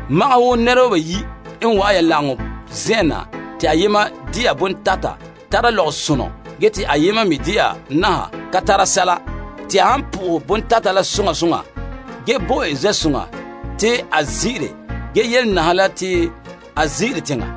Magahɛ wo nɛreba bayi' han wa'an ya lagaŋɔ zen'en na te ayema dena bontata tara lɔgɔsonɔ gee te ayema me dena naha ka tara sɛla, te ya han po'ohɛ bontata la soŋa soŋa ge bo en zen'soŋa te a zin'ire ge yele naha la te a zin'ire teŋa.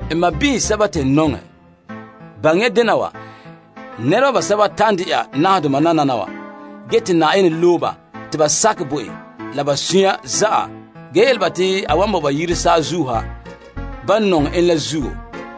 N sɔɔnrɔ sɛba te n nɔŋɛ, baŋɛ ya dena wa, nɛreba basɛba ta'an dena nahadoma nananawa ge te Yenɛ loe ba te ba sakɛ bo en la ba sunya zan'an ge yele ba te a wan bo ba yire saazuo ha, ban nɔŋɛ en la zuo.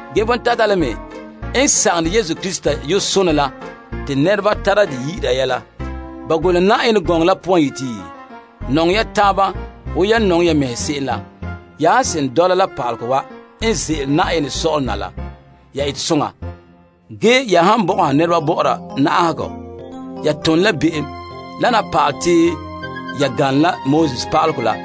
Ge bontateba la me n sagone Krista yu'urɛ sonɛ la te nɛreba tara dɛ yi'ira ya la. Ba golehe Yenɛ gɔŋɔ la poan yeti, Nɔŋɛ ho tadaana wo hom nɔŋɛ ho mɛŋa se'em la. Ya han seren dɔla pa'alegɔ wa n ze'ele Yenɛ sɔ'ɔlom na la, ya ete soŋa. Gee ya han bɔgɔha nɛreba bɔ'ɔra na'ahegɔ, ya tone la be'em. Lana pa'alɛ te ya ganlom la pa'alegɔ la.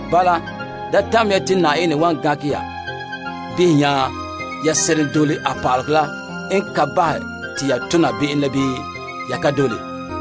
Bala, da tamɛ ya te Yenɛ wan gankɛ ya behɛ nya ya seren dole a pa'alegɔ la n ka bahɛ te ya tona be'em la bii ya ka dole.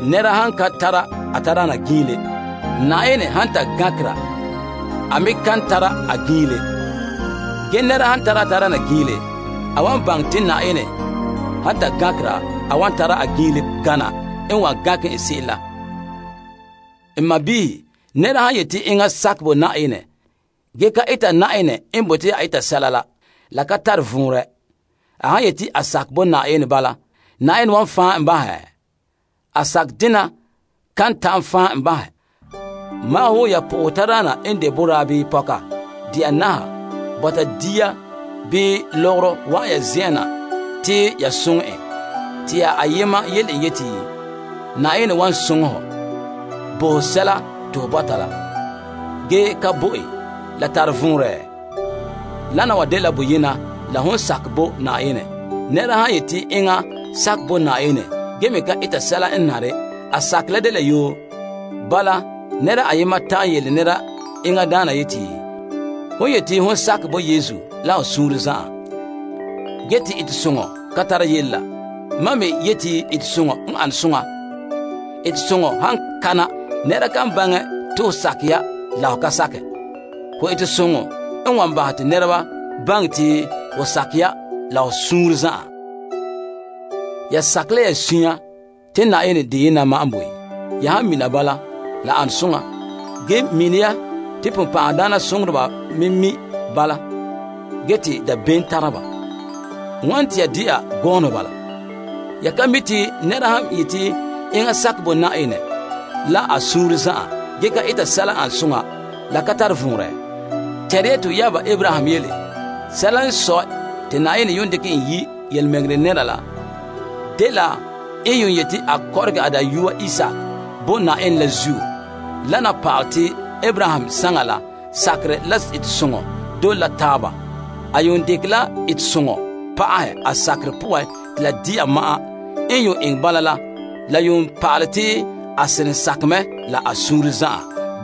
Nɛra han ka tara a tadaana giinle, Na'ayenɛ han ta gankera, a me kan tara a giinle. Ge nɛra han tara a tadaana giinle, a wan baŋɛ te Na'ayenɛ han ta gankera, a wan tara a giinle gana n wan gankɛ en se'em la. N sɔɔnrɔ, nɛra han yeti enŋa sakɛ bo Na'ayenɛ ge ka eta Na'ayenɛ n bote a eta sɛla la, la ka tare vɔnrɛ. A han yeti a sakɛ bo Na'ayenɛ bala, Na'ayenɛ wan fan' en bahɛ? A sakɛ dena kan ta'an fan' en bahɛ. Magahɛ wo ya po'ohɛ tadaana n de boraa bii pɔka dena naha bɔta dia bii lɔgɔrɔ wa'an ya zen'en na te ya soŋɛ en te ya ayema yele en yeti, Na'ayenɛ wan soŋɛ hɔ bo ho sɛla te ho bɔta la, ge ka bo en, la tare vɔnrɛ? Wana wa dela boyena la hon sakɛ bo Na'ayenɛ. Nɛra han yeti enŋa sakɛ bo Na'ayenɛ gee me ka eta sɛla n nare, a sakerɛ la dela yoo. Bala, nɛra ayema ta'an yeti, Hon yeti hon sakɛ bo Yesu la ho suunre zan'an ge te etesoŋɔ ka tara yele la, mam me yeti etesoŋɔ n ane soŋa. Etesoŋɔ han kana, nɛra kan baŋɛ te ho sakɛ ya la ho ka sakɛ. Ho etesoŋɔ n wan bahɛ te nɛreba baŋɛ te ho sakɛ ya la ho suunre zan'an. Ya sakɛ la ya sunya te Na'ayenɛ deyena ma'an n boe. Ya han mina bala, la ane soŋa. Ge mini ya te ponpan'ahadaana soŋoreba me mi' bala, gee te dabeem tara ba. Wane te ya de'a gɔɔnɔ bala? Ya ka mi' te nɛra han yeti enŋa sakɛ bo Na'ayenɛ la a suunre zan'an ge ka eta sɛla n an soŋa, la ka tare vɔnrɛ? Tɛnre ya to yaaba Abraham yele. Sɛla n sɔe te Na'ayenɛ yuun dekɛ en yi' yelemɛŋɛrɛ nɛra la dela n yuun yeti a kɔrɔgɛ a dayɔa Isaak bo Na'ayenɛ la zuo. Dɛna pa'alɛ te Abraham saŋan la, sakerɛ la etesoŋɔ dole la taaba. A yuun dekɛ la etesoŋɔ pa'ahɛ a sakerɛ poan te la de'a ma'an. N yuun eŋɛ bala la, la yuun pa'alɛ te a seren sakɛ mɛ la a suunre zan'an.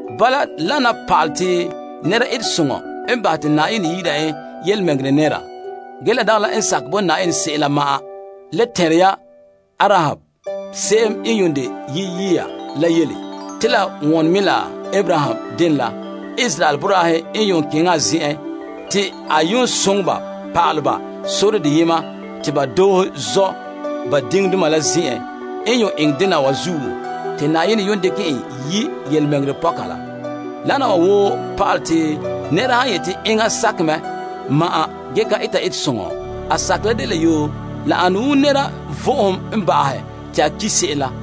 Bala, wana pa'alɛ te nɛra etesoŋɔ n bahɛ te Na'ayenɛ yi'ira en yelemɛŋɛrɛ nɛra, ge la dagɛ la n sakɛ bo Na'ayenɛ se'em la ma'an. Le tɛnre ya Arahab se'em n yuun de yaloma la yele, te la wone mɛ la Abraham denɛ la. Israel boraahe n yuun keŋɛ a zen'en te a yuun soŋɛ ba pa'alɛ ba sore deyema te ba doohe zɔ' ba diŋdoma la zen'en. N yuun eŋɛ dena wa zuo te Na'ayenɛ yuun dekɛ en yi' yelemɛŋɛrɛ pɔka la. Wana wa woo pa'alɛ te nɛra han yeti enŋa sakɛ mɛ ma'an ge ka eta etesoŋɔ, a sakerɛ la dela yoo. La ane wo nɛra vo'ohom n ba'ahɛ te a ki' se'em la.